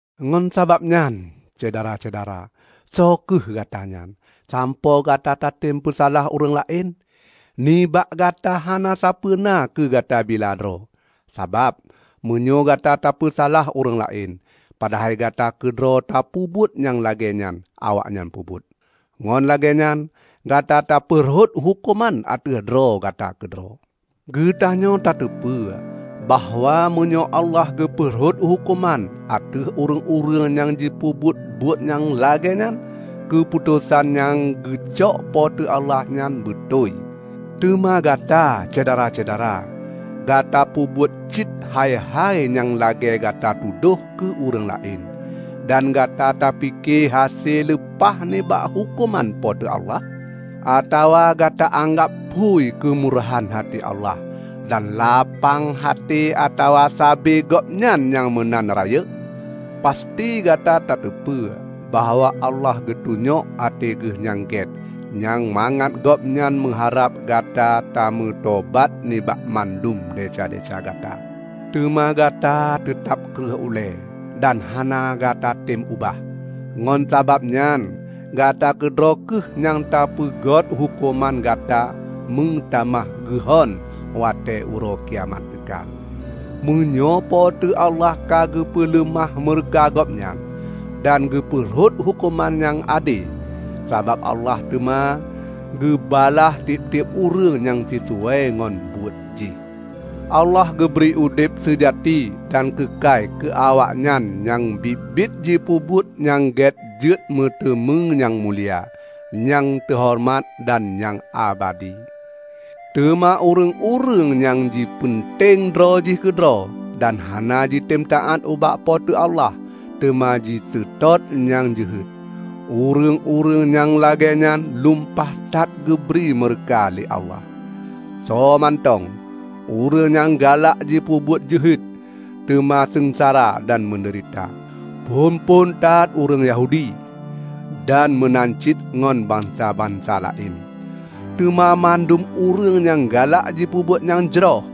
Ngon sabab nyan, Syedara-syedara, soe kheueh Gatanyan, sampoe Gata tatem peusalah ureuëng laén? Nibak Gata hana sapeuena keu gata bila droe! Sabab, meunyoe Gata tapeusalah ureuëng laén, padahai Gata keudroe tapeubuet nyang lagée awaknyan peubuet, ngon lagée nyan Gata katapeurhot huköman ateueh droe gata keudroe. Geutanyoe tateupeue bahwa meunyoe Allah geupeurhot huköman ateueh ureuëng-ureuëng nyang jipeubuet buet-buet nyang lagée nyan, keuputosan nyang geucok Po teu Allah nyan beutôi. Teuma gata, Syedara-syedara, gata peubuet cit hai-hai nyang lagée gata tudoh keu ureuëng laén! Dan gata tapike hase leupah nibak huköman Po teu Allah? Atawa gata anggab phui keumurahan até Allah dan lapang até atawa saba Gobnyan nyang meunan rayeuk? Pasti gata tateupeue bahwa Allah geutunyok até geuh nyang gét nyan mangat Gobnyan meuharab gata tameutobat nibak mandum desya-desya gata. Teuma gata teutab kreueh ulée dan hana gatatem ubah. Ngon sabab nyan gata keudroe kheueh nyang tapeugét huköman gata meutamah geuhon watée Uroe Kiamat teuka, meunyoe Po teu Allah ka geupeuleumah meureuka Gobnyan dan geupeurhot huköman nyang ade. Sabab Allah teuma geubalah tieb-tieb ureuëng nyang sisuai ngon buet jih. Allah geubri udeb seujati dan keukai keu awaknyan nyang biet-biet jipeubuet nyang gét jeuet meuteumé nyang mulia, nyang teuhoreumat dan nyang abadi. Teuma ureuëng-ureuëng nyang jipeunteng droe jih keudroe dan hana jitem taát ubak Po teu Allah, teuma jiseutôt nyang jeuhet, ureuëng-ureuëng nyang lagée nyan lumpah that geubri meureuka lé Allah. Soe mantong ureuëng nyang galak jipeubuet jeuhet teuma seungsara dan meudeurita; phon-phon that ureuëng Yahudi, dan meunan cit ngon bansa-bansa laén. Teuma mandum ureuëng nyang galak jipeubuet nyang jroh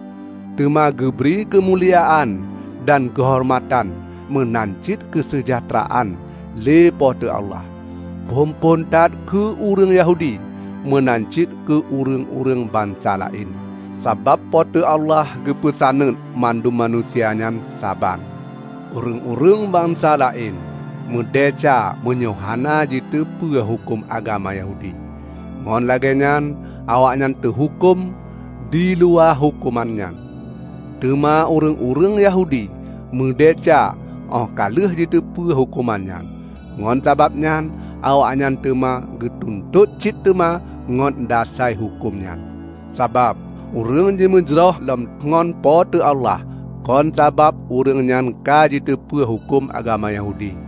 teuma geubri keumuliaan dan keuhoreumatan meunan cit keuseujahteuraan lé Po teu Allah; phon-phon that keu ureuëng Yahudi, meunan cit keu ureuëng-ureuëng bansa laén. Sabab Po teu Allah geupeusaneut mandum manusia nyan saban. Ureuëng-ureuëng bansa laén meudesya meunyoe hana jiteupeue huköm agama Yahudi. Ngon lagée nyan awaknyan teuhuköm diluwa huköm nyan. Teuma ureuëng-ureuëng Yahudi meudesya óh ka lheueh jiteupeu huköm nyan; ngon sabab nyan awaknyan teuma geutuntot cit teuma ngon dasai huköm nyan. Sabab ureuëng jimeujroh lom ngon Po teu Allah, kon sabab ureuëng nyan ka jiteupeue huköm agama Yahudi,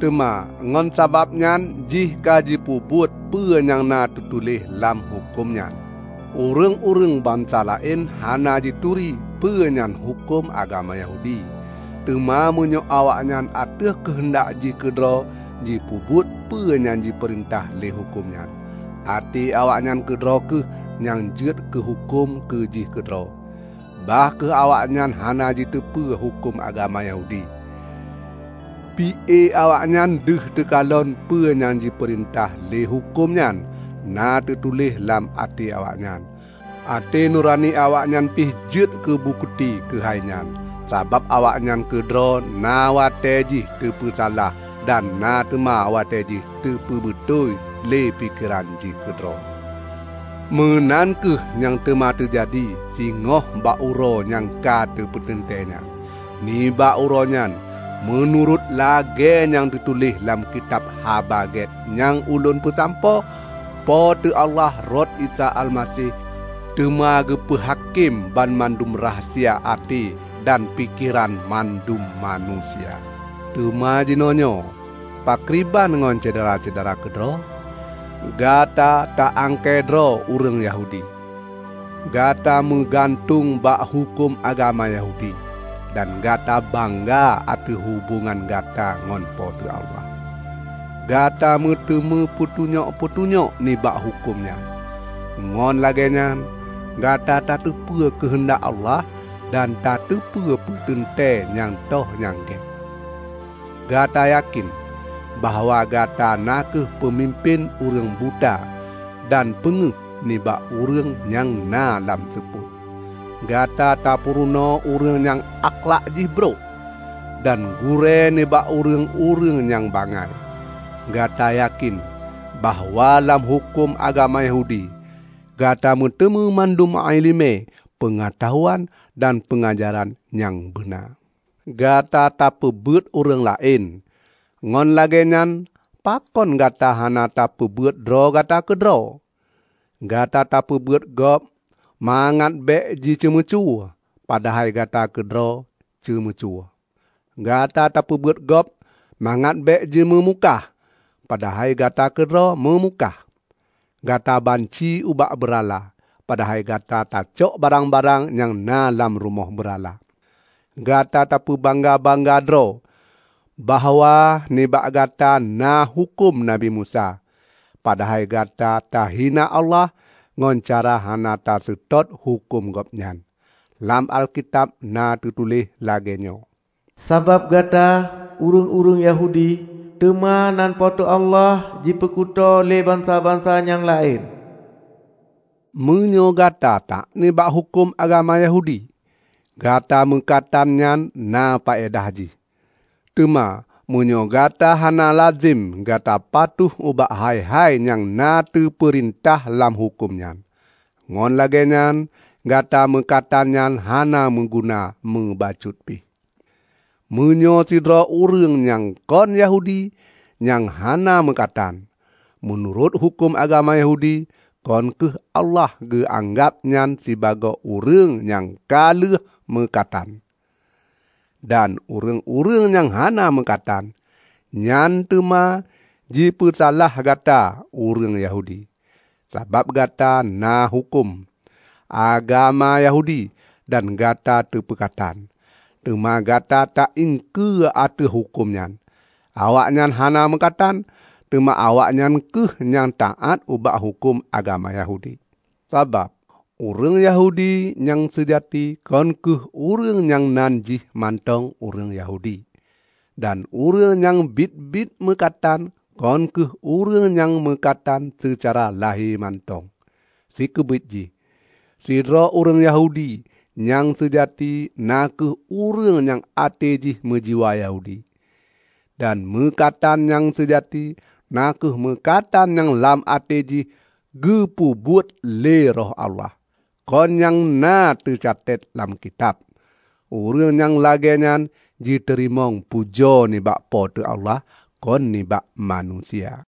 teuma ngon sabab jihnyan ka jipeubuet peue nyang na teutuléh lam huköm nyan. Ureuëng-ureuëng bansa laén hana jituri peue nyan huköm agama Yahudi. Teuma meunyoe awaknyan ateueh keuheundak jih keudroe jipeubuet peue nyang jipeurintah lé huköm nyan, até awaknyan keudroe kheueh nyan jeuet keuhuköm keu jih keudroe, bah kheueh awaknyan hana jiteupeue huköm agama Yahudi. Pi-e awaknyan deuh teukalon peue nyang jipeurintah lé huköm nyan na teutuléh lam até awaknyan. Até nurani awaknyan pih jeuet keubukeuti keuhai nyan, sabab awaknyan keudroe na watée jih teupeusalah dan na teuma watée jih jipeubeutôi lé pikeran jih keudroe. Meunan kheueh nyang teuma teujadi singoh bak uroe nyang ka teupeuteuntée nyan. Nibak uroe nyan -- meunurot lagée nyang teutuléh lam kitab Haba Gét nyang ulôn peusampoe -- Po teu Allah rot Isa Almaseh, teuma geupeu hakém banmandum rahsia até dan pikeran mandum manusia. Teuma jinoenyoe pakriban ngon Syedara-syedara keudroe? Gata ta angkée droe ureuëng Yahudi. Gata meugantueng bak huköm agama Yahudi dan Gata bangga ateueh hubongan Gata ngon Po teu Allah. Gata meuteumé peutunyok-peutunyok nibak huköm nyan, ngon lagée nyan Gata tateupeue keuheundak Allah dan tateupeue peuteuntée nyang toh nyang gét. Gata yakén bahwa Gata na kheueh peumimpén ureuëng buta dan peungéh nibak ureuëng nyang na lam seupôt; Gata tapurunoe ureuëng nyang akhlak jih brok, dan gurée nibak ureuëng-ureuëng nyang bangai. Gata yakén bahwa lam huköm agama Yahudi, Gata meuteumé mandum iéleumé peungeutahuan dan peungajaran nyang beuna. Gata tapeubeuet ureuëng laén; ngon lagée nyan pakon Gata hana tapeubeuet droe gata keudroe? Gata tapeubeuet gob mangat bék jiceumeucue, padahai Gata keudroe ceumeucue! Gata tapeubeuet gob mangat bék jimeumukah, padahai Gata keudroe meumukah! Gata banci ubak beurala, padahai Gata tacok barang-barang nyang na lam rumoh beurala. Gata tapeubangga-bangga droe bahwa nibak Gata na huköm Nabi Musa, padahai Gata tahina Allah ngon cara hana taseutôt huköm Gobnyan. Lam Alkitab na teutuléh lagée nyoe, "Sabab gata, ureuëng-ureuëng Yahudi, teuma nan Po teu Allah jipeukuto lé bansa-bansa nyang laén." Meunyoe Gata taát nibak huköm agama Yahudi, Gata meukatan nyan na paedah jih. Teuma meunyoe gata hana lazem Gata patuh ubak hai-hai nyang na teupeurintah lam huköm nyan, ngon lagée nyan Gata meukatan nyan hana meuguna mubacut pih. Meunyoe sidroe ureuëng nyang kon Yahudi nyang hana meukatan, meunurot huköm agama Yahudi, kon kheueh Allah geuanggab nyan sibagoe ureuëng nyang ka lheueh meukatan? Dan ureuëng-ureuëng nyang hana meukatan nyan teuma jipeusalah Gata ureuëng Yahudi, sabab Gata na huköm agama Yahudi dan Gata teupeukatan, teuma Gata ta iengkeue ateueh huköm nyan. Awaknyan hana meukatan, teuma awaknyan kheueh nyang taát ubak huköm agama Yahudi. Sabab ureuëng Yahudi nyang seujati kon kheueh ureuëng nyang nan jih mantong ureuëng Yahudi; dan ureuëng nyang biet-biet meukatan kon kheueh ureuëng nyang meukatan seucara lahé mantong. Sikeubiet jih, sidroe ureuëng Yahudi nyang seujati na kheueh ureuëng nyang até jih meujiwa Yahudi; dan meukatan nyang seujati na kheueh meukatan nyang lam até jih geupeubuet lé Roh Allah, kon nyang na teucetet lam kitab. Ureuëng nyang lagée nyan jiteurimong pujoe nibak Po teu Allah, kon nibak manusia.